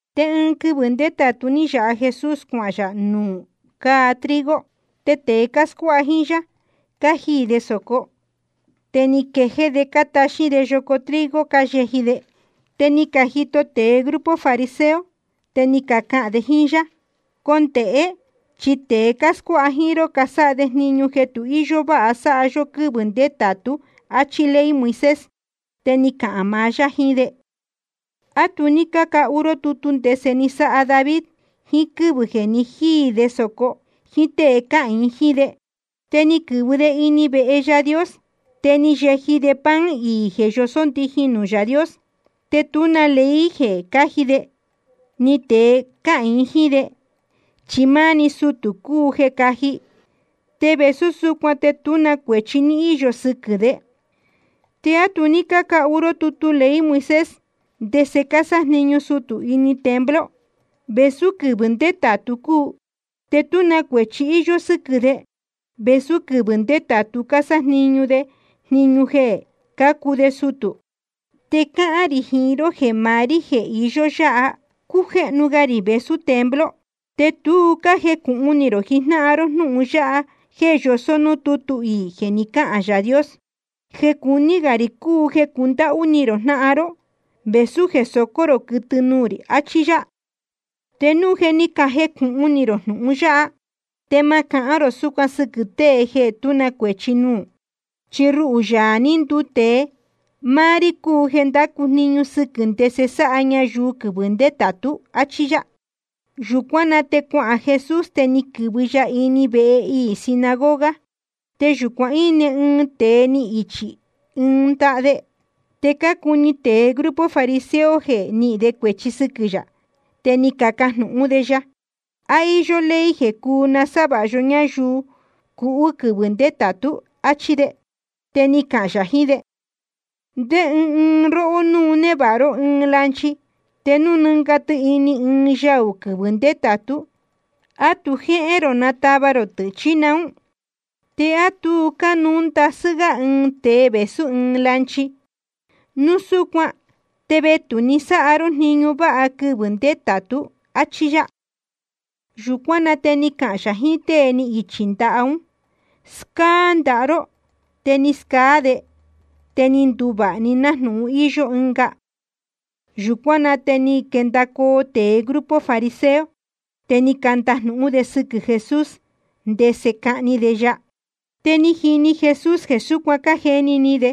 Te ɨɨn quɨvɨ̄ ndétātu ní yāha Jesús cuahān yā nuū cáa trigo. Te tēe cáscuáha jíín yá, cájiī de sōco. Te ni quejéé de cátaxín de yoco trigo cáyeji de. Te ni cajito tēe grupo fariseo, te ni cacahān de jíín yá: Condēhé, chi tēe cáscuáha jíín ró casáha de jniñu jeē tu íyó váha sáha yó quɨ́vɨ̄ ndétātú, áchí ley Moisés. Te ni cahān maá yá jiín de: ¿A tu ní cácahu ró tutu ndese ni sáha David, ɨɨn quɨvɨ̄ jeē ni jíī de sōco jíín tée cáhīin jíín de? Te ni quɨ̄vɨ de ini vehe Yaā Dios. Te ni yeji de pan iī jeē yosó ndijin nuū Yaā Dios. Te tú na ley jeē cáji de, ni tēe cáhīin jíín de, chi máá‑ni sutū cuu caji. Te vēsú súcuan te tú na cuēchi ní íyo sɨquɨ̄ de. ¿Te á tu ní cácahu ró tutu ley Moisés, ndese cásájniñu sutū ini templo, vēsú quɨvɨ̄ ndétātu cúu? Te tú na cuēchi íyó sɨ́quɨ̄ de, vēsú quɨvɨ̄ ndétātu cásájniñu de jniñu jeē cácuu de sutū. Te cáhán rī jiín ró jeē maá rí jeē iyó yáha, cújéhnu ga rī vēsú templo. Te tu cájecūhun ni rō jijnáhan ró jnūhun yáha jeē yosó núū tútu iī jeē ni cáhān Yaā Dios: Jeē cuní gā rī cúu jeē cundáhú ni rō jnáhan ró, vēsú jeē socó rō quɨtɨ nuū rī, achí yá. Te núu jeē ní cajecūhun ni rō jnūhun yáha, te ma cahán rō súcuan sɨquɨ̄ tée jeē tú na cuēchi núú. Chi ruhū, Yaā ní nduu tēe, máá rí cúu jeē ndácu jniñu sɨquɨ̄ ndese sáha ñayuu quɨvɨ̄ ndétātú, áchí yá. Yūcuán na te cuahān Jesús, te ni quɨ̄vɨ ya ini vehe iī sinagoga. Te yūcuan íne ɨɨn tēe ni ichī ɨɨn ndaha de. Te cácuni tēe grupo fariseo jeē nihīn de cuēchi sɨquɨ̄ yā, te ni cacajnūhún de ya: ¿A íyó ley jeē cuu nasávāha yó ñayuu cuhú quɨvɨ̄ ndétātú? áchí de. Te ni cahān yā jiín de: ¿Ndé ɨɨn róhó, núu névāha ró ɨɨn lanchi, te núu nɨ́nga tɨ ini ɨɨn yaū quɨvɨ̄ ndétātú, te á tu jéhén rō natava rō tɨ̄, chí naún? ¿Te á tu cánuú ndasɨ́ gá ɨɨn tēe vēsú ɨɨn lanchi? Núu súcuan te vetū‑ni sáha yó jniñu váha quɨvɨ̄ ndétātú, áchí yá. Yūcuán na te ni cahān yā jiín tée ni ichī ndaha ún: Scáá ndaha ró. Te ni scaá de, te ni nduvāha‑ni nájnūhun íyó ɨnga. Yūcuán na te ni quendacoo tēe grupo fariseo, te ni candajnūhún de sɨquɨ̄ Jesús, ndese cahni de ya. Te ni jini Jesús jeē súcuan cájeni ni de,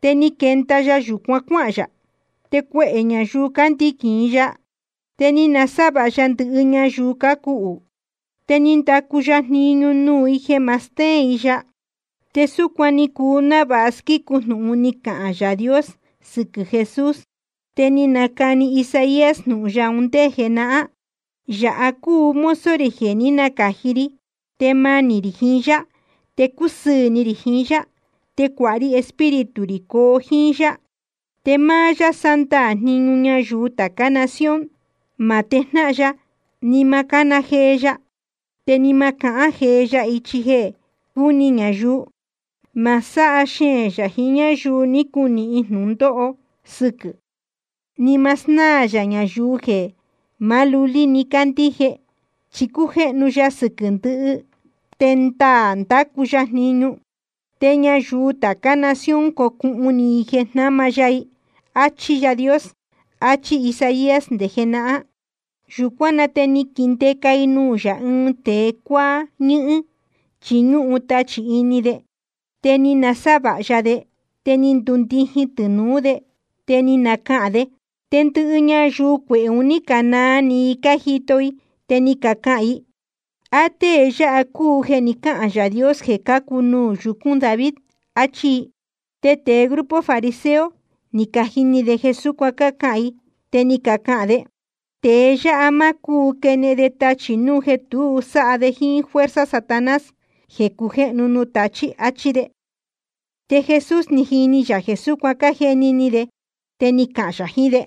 te ni quenda ya yūcuan cuáhān yā. Te cuehē ñayuu cándiquīn i ya. Te ni nasávāha ya ndɨhɨ ñayuu cuhú. Te ni ndacu ya jniñu nuū i jeē ma stéén i ya. Te súcuan ni cuu návāha squícu jnūhun ni cahān Yaā Dios sɨquɨ̄ Jesús, te ni nacani Isaías jnūhun ya un ndé jenahán: Yāha cúu mozo rī jeē ní nacāji ri, te manī rī jiín yá, te cúsɨɨ̄ ni rī jiín yá. Te cuāha ri Espíritu rī coo jíín yá. Te máá yá sándaā jniñu ñayuu tācá nación. Ma tejnáhan ya, ni ma cána jee ya, te ni ma cahán jee ya ichi jeē cúni ñayuu. Ma sáha xeēn yā jiín ñáyuu ni cunīhin jnūndóho sɨquɨ̄, ni ma snáā yā ñayuu jeē maá lulí‑ni cácandíje. Chi cujéhnu ya sɨquɨ̄ ndɨhɨ, te ndaā ndacu ya jniñu. Te ñayuu tācá nación cocuhun ni i jeē jnáma ya i. Achí Yaā Dios, achí Isaías nde jenahán. Yūcuán na te ni caquindeca i nuū yā ɨɨn tēe cuáá ñɨ́hɨ́n, chi ñúhun tachī ini de. Te ni nasávāha ya de. Te ni ndundijin tɨnūú de te ni nacahān de. Te ndɨhɨ ñayuu cuehē un ní canaa ni i cájito i, te ni cacahān i: ¿A tée yáha cúu jeē ni cáhān Yaā Dios jeē cacu nuū yucūn David? áchí i. Te tēe grupo fariseo, ni cajini de jeē súcuan cácahān i. Te ni cacahān de: Tēe yáha ma cúu quenehen de tachī núu jeē tu sáha de jíín fuerza Satanás jeē cujéhnu nuū tachí, áchí de. Te Jesús ni jini yā jeē súcuan cájeni ni de, te ni cahān yā jiín de: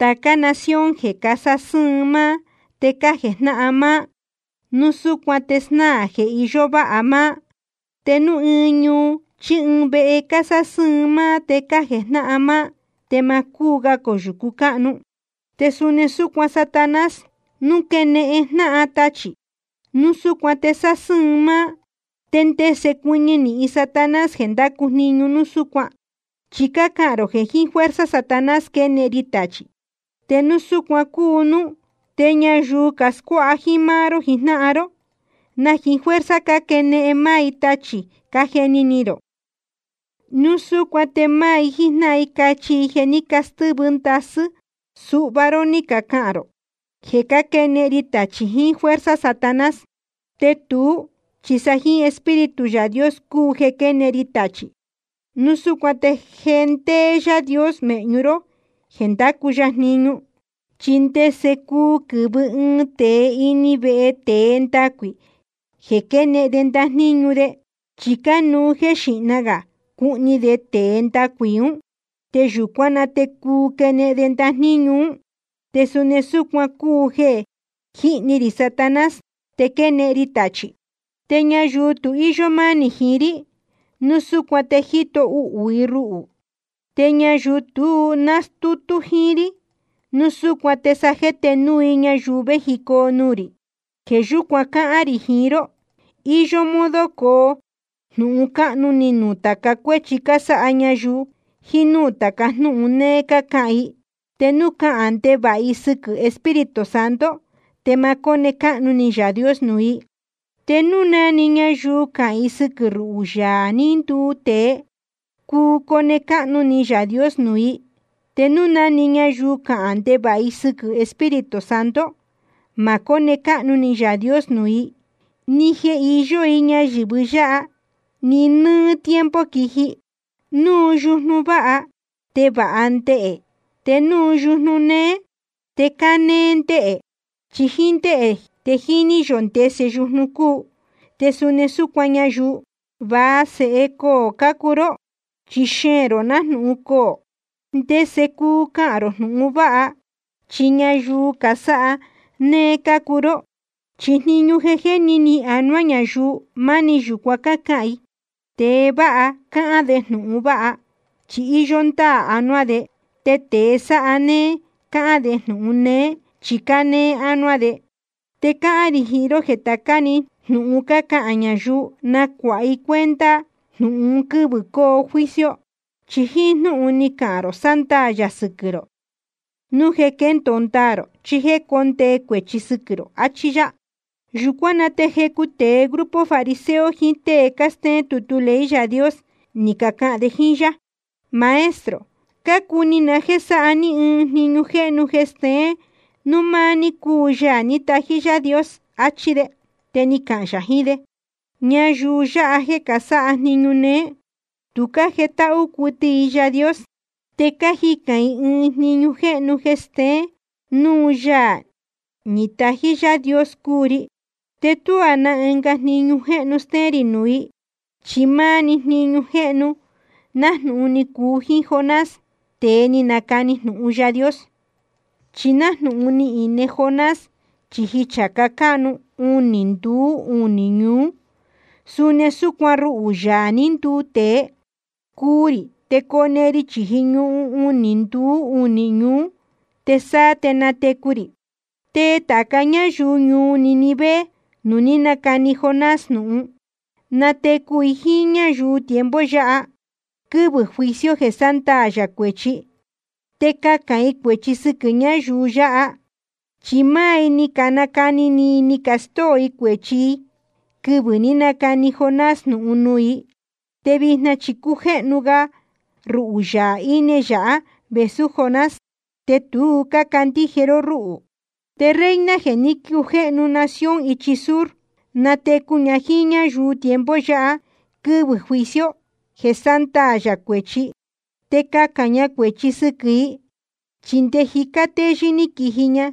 Tācá nación jeē casásɨ́ɨn máá te cájejnáhan máá, núu súcuan te snáā jeē iyó váha máá. Te núu ɨɨn ñuu chí ɨɨn vehe cásásɨ́ɨn máá te cájejnáhan máá, te ma cúu ga coyūcu cáhnu. Te suni súcuan Satanás núu quénehen jnáhan tachī, núu súcuan te sásɨ́ɨn máá. ¿Te ndese cuɨñɨ nīhin Satanás jeē ndácu jniñu núu súcuan? Chi cácahān rō jeē jiín fuerza Satanás quénehen ri tachī. Te núu súcuan cúu núú, te ñayuu cascuáha jíín máá ró jijnáhan ró, ¿na jiín fuerza cáquenehen máá i tachī, cájeni ni rō? Núu súcuan te máá i jíjnáhan i cachi jeē ní castɨ́vɨ ndasɨ́ suhva ró ni cacahān rō jeē cáquenehen ri tachī jiín fuerza Satanás. Te tuú chi sa jíín Espíritu Yaā Dios cúu jeē quénehen ri tachī. Núu súcuan te je ndéé Yaā Dios mēhñu ró jeē ndácu ya jniñu. ’¿Chi ndese cuu quɨ̄vɨ ɨɨn tēe ini vehe tēe ndacuī jeē quenehen de ndajníñu de? Chi cánuú jeē xíhna gā cuhni de tēe ndacuī ún, te yūcuán na te cuu quenehen de ndajníñu ún. Te suni súcuan cúu jeē jíhni rī Satanás te quénehen ri tachī. ’Te ñayuu tu íyó mánī jiín rí, núu súcuan te jíto uhū i ruhū. Te ñayuu tu nástútú jíín rí, núu súcuan te sa jéte núu i ñayuu vējicoo nuū rī. ’Jeē yúcuan cáhán rī jiín ró: Iyó modo coo jnūhun cáhnu ni nuū tāca cuéchi cásáha ñayuu, jiín núū tāca jnúhun néé cácahān i. Te núu cahān ndevāha i sɨquɨ̄ Espíritu Santo, te ma cóne cáhnu ni Yaā Dios nuū i. Te núu na‑ni ñayuu cahān i sɨquɨ̄ ruhū, Yaā ní nduu tēe, cuu cone cáhnu ni Yaā Dios nuū i. Te núu na‑ni ñayuu cahān ndevāha i sɨquɨ̄ Espíritu Santo, ma cóne cáhnu ni Yaā Dios nuū i, ni jeē iyó i ñayɨ̄vɨ yáha, ni nɨ́ɨ́ tiempo quíji. ’Núu yujnu váha, te vāha ndehē, te núu yujnu néé, te cánéé ndehē. Chi jíín ndéhē te jíní yō ndese yujnu cúu. Te suni súcuan ñayuu. Va sēhe coō cácuu ró, chi xeēn rō nájnūhun coō. ¿Ndese cuu cahān rō jnūhun vāha, chi ñayuu cásáha néé cácuu ró? Chi jniñu jeē jéni ni anuá ñayuu, máni yūcuan cáhán i. Tēe vāha cáhán de jnūhun vāha, chi íyó ndáā anuá de. Te tēe sáha néé cáhán de jnūhun néé, chi cánéé ánuá de. Te cáhán rī jiín ró jeē tācá na‑ni jnūhun cácahān ñayuu, nacuāha i cuenta jnūhun un quɨ́vɨ̄ coo juicio. Chi jíín jnúhun ni cahān rō sándaā yā sɨquɨ̄ rō, núu jeē quéndōo ndaā rō chí jéē cóndee cuēchi sɨquɨ̄ rō. Achí yá. Yūcuán na te jecu tēe grupo fariseo jiín tée cástéén tutu ley Yaā Dios, ni cacahān de jíín yá: Maestro, cácuni na jéē sáha ní ɨɨn jniñu jéhnu jeē steén núu máá ní cúu Yaā ní tají Yaā Dios, achí de. Te ni cahān yā jiín de: Ñayuu yáha jeē casáha jniñu néé, tu cájetáhú cuɨtɨ i Yaā Dios. Te cájicān i ɨɨn jniñu jéhnu jeē steén núu Yaā ní tají Yaā Dios cúu ri. Te tuá na ɨnga jniñu jéhnu stéén rī nuū i, chi máá‑ni jniñu jéhnu nájnūhun ni cuu jíín Jonás, tēe ni nacani jnūhun Yaā Dios. Chi nájnūhun ni ine Jonás chīji chācá cáhnu unī nduú unī ñuú, suni súcuan ruhū, Yaā ní nduu tēe, cuu rī te cone ri chīji ñuhun unī nduú unī ñuú, te sáá te natecu rī. Te tāca ñáyuu ñuu Nínive nuū ní nacani Jonás jnūhun, natecu i jíín ñáyuu tiempo yáha, quɨvɨ̄ juicio jeē sándaā yā cuēchi, te cahān i cuēchi sɨquɨ̄ ñáyuu yáha. Chi máá i ni canacani ni i ni castóo i cuēchi i quɨvɨ̄ ní nacani Jonás jnūhun nuū i. Te vijna chi cújéhnu ga ruhū Yaā íne yāhá vēsú Jonás, te tu cácandíje ró rúhū. Te reina jeē ní cujéhnu nación ichi sur, natecu ña jíín ñáyuu tiempo yáha, quɨvɨ̄ juicio jeē sándaā yā cuēchi, te cahān ña cuēchi sɨquɨ̄ i. Chi nde jicá téyɨ́ ní quiji ña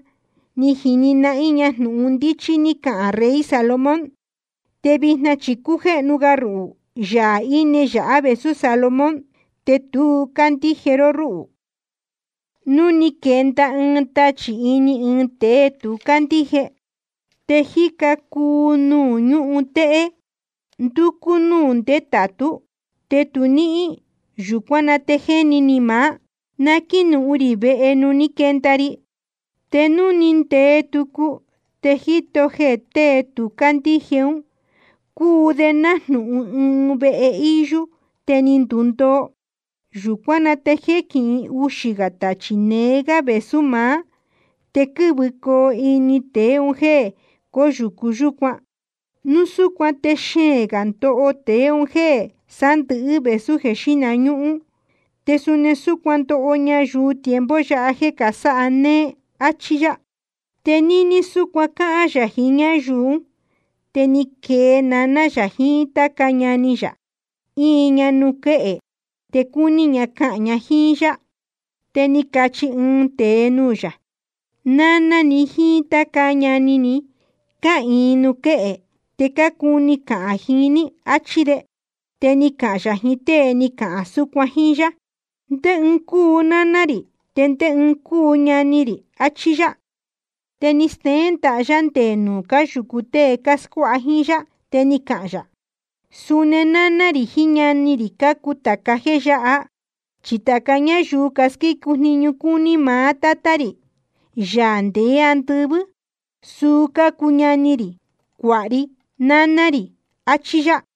ni jini nahín ña jnūhun ndíchí ní cahān rey Salomón. Te vijna chi cújéhnu ga ruhū, Yaā íne yāhá vēsú Salomón, te tu cácandíje ró rúhū. ’Núu ni quenda ɨɨn tachī ini ɨɨn tēe tu cándíje, te jíca cuu nuū ñúhun téhé, ndúcú núū ndétātú, te tu níhín, yūcuán na te jéni ni maá: Na quínuhun rī vehe nuū ní quenda ri. Te núu ni ndee tucu, te jíto jeē tēe tu cándíje ún, cúu de nájnūhun ɨɨn vehe íyú te ni ndundoo. Yūcuán na te jéquihin uxā gā tachī neé gá vēsú maá. Te quɨ́vɨcoo ini tēe un jéē cóyūcu yúcuan. Núu súcuan te xeēn gā ndoho tēe un jéē sándɨ̄hɨ́ vēsú jeē xíhna ñúhún. Te suni súcuan ndoho ñayuu tiempo yáha jeē casáha néé. Achí yá. Te níní súcuan cáhán yā jiín ñáyuu ún, te ni quee naná yā jiín táca ñani yā, íin ña nuū quéhe, te cúní ña cahān ña jíín yá. Te ni cachi ɨɨn tēe nuū yā: Náná ni jíín táca ñani ni cáhīin nuū quéhe, te cácuni cahān jiín ní, achí de. Te ni cahān yā jiín tée ni cahān súcuan jíín yá: ¿Ndé ɨɨn cúu náná rī, te ndé ɨɨn cácuu ñani rī? Achí yá. Te ni steén ndaha yá nde nuū cáyūcu tée cáscuáha jíín yá. Te ni cahān yā: Suni náná rī jiín ñani rī cácuu tāca jéē yáha. Chi tāca ñáyuu casquícu jniñu cúní maá Tátá rī, Yaā ndeé andɨvɨ́, suu cácuu ñani rī, cuāha ri, náná rī. Achí yá.